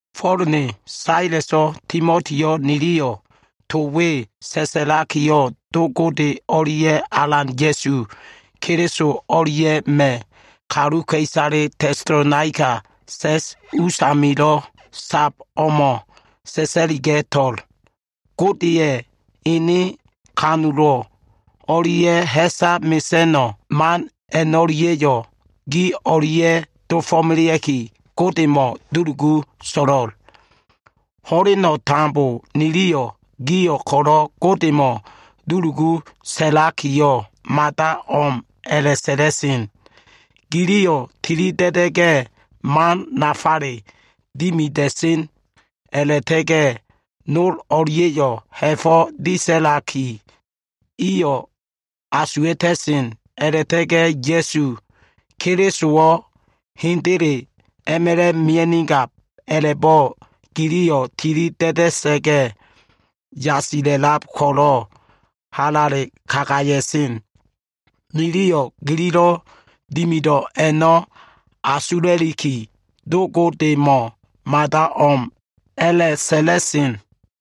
Fo꞉l ne, Saleso꞉, Timotiyo꞉ niliyo꞉ to we sa꞉sa꞉lakiyo꞉, Do Gode o꞉lia꞉ Alan Ya꞉su Keliso o꞉lia꞉ma꞉ kaluka꞉isale, Tesalonaika sa꞉s usamilo꞉ sab o꞉mo꞉ sa꞉sa꞉liga꞉to꞉l. Godeya꞉ ene ha꞉fo꞉ disa꞉lan man o꞉lia꞉ ha꞉sa mesa꞉no꞉ man a꞉no꞉lia꞉yo꞉ gi o꞉lia꞉ dofo꞉melea꞉ki, Godemo꞉ dulugu so꞉lo꞉l. Ho꞉leno꞉ tambo niliyo꞉ gio꞉ ko꞉lo꞉ Godemo꞉ dulugu sa꞉lakiyo꞉, mada o꞉m a꞉la꞉sa꞉la꞉sen. Giliyo꞉ tilida꞉da꞉ga꞉ man nafale dimida꞉sen, a꞉la꞉ta꞉ga꞉ nol o꞉lia꞉yo꞉ ha꞉fo꞉ disa꞉laki iyo꞉ asuwa꞉ta꞉sen, a꞉la꞉ta꞉ga꞉ Ya꞉su Kelisowo꞉ hendele a꞉ma꞉la꞉ mia꞉nigab a꞉la꞉bo꞉ giliyo꞉ tilida꞉da꞉sa꞉ga꞉ yasila꞉lab ko꞉lo꞉ halale kagaya꞉sen. Niliyo꞉ gililo꞉ dimido꞉ a꞉no꞉ asula꞉liki, Do Godemo꞉ mada o꞉m a꞉la꞉sa꞉la꞉sen.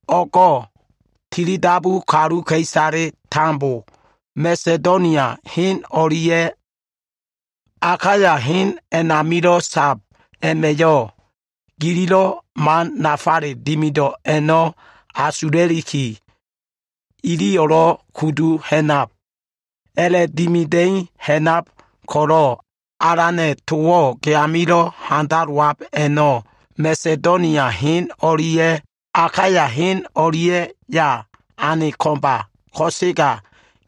O꞉go꞉ tilidabu kaluka꞉isale tambo Masedonia hen o꞉lia꞉ Akaya hen a꞉namilo꞉ sab a꞉ma꞉yo꞉ gililo꞉ man nafale dimido꞉ a꞉no꞉ asula꞉liki, iliyo꞉lo꞉ kudu ha꞉nab. A꞉la꞉dimida꞉i ha꞉nab ko꞉lo꞉ Alana꞉ towo꞉ ge amilo꞉ handalowab a꞉no꞉ Masedonia hen o꞉lia꞉ Akaya hen o꞉lia꞉ya ane ko꞉mba. Ko꞉sega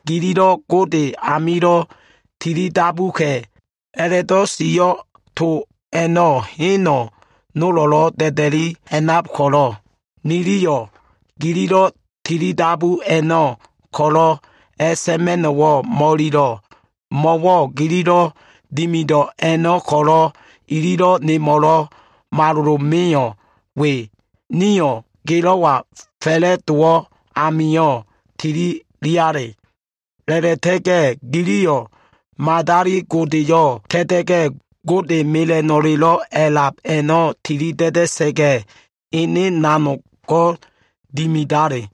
gililo꞉ Gode amilo꞉ tilidabuka꞉ a꞉la꞉do꞉ sio꞉ to a꞉no꞉ hen nolo꞉lo꞉ da꞉da꞉li ha꞉nab ko꞉lo꞉, niliyo꞉ gililo꞉ tilidabu a꞉no꞉ ko꞉lo꞉ a꞉sa꞉ma꞉no꞉wo꞉ mo꞉ililo꞉. Mo꞉wo꞉ gililo꞉ dimido꞉ a꞉no꞉ ko꞉lo꞉ ililo꞉ nemo꞉lo꞉ malolo meo꞉ we. Nio꞉ gelo꞉wa fa꞉la꞉dowo꞉ amio꞉ tililiale. A꞉la꞉ta꞉ga꞉ giliyo꞉ madali godeyo꞉ ta꞉ta꞉ga꞉, Gode mela꞉no꞉lelo꞉ a꞉lab a꞉no꞉ tilida꞉da꞉sa꞉ga꞉, ene nanogo꞉ dimidale.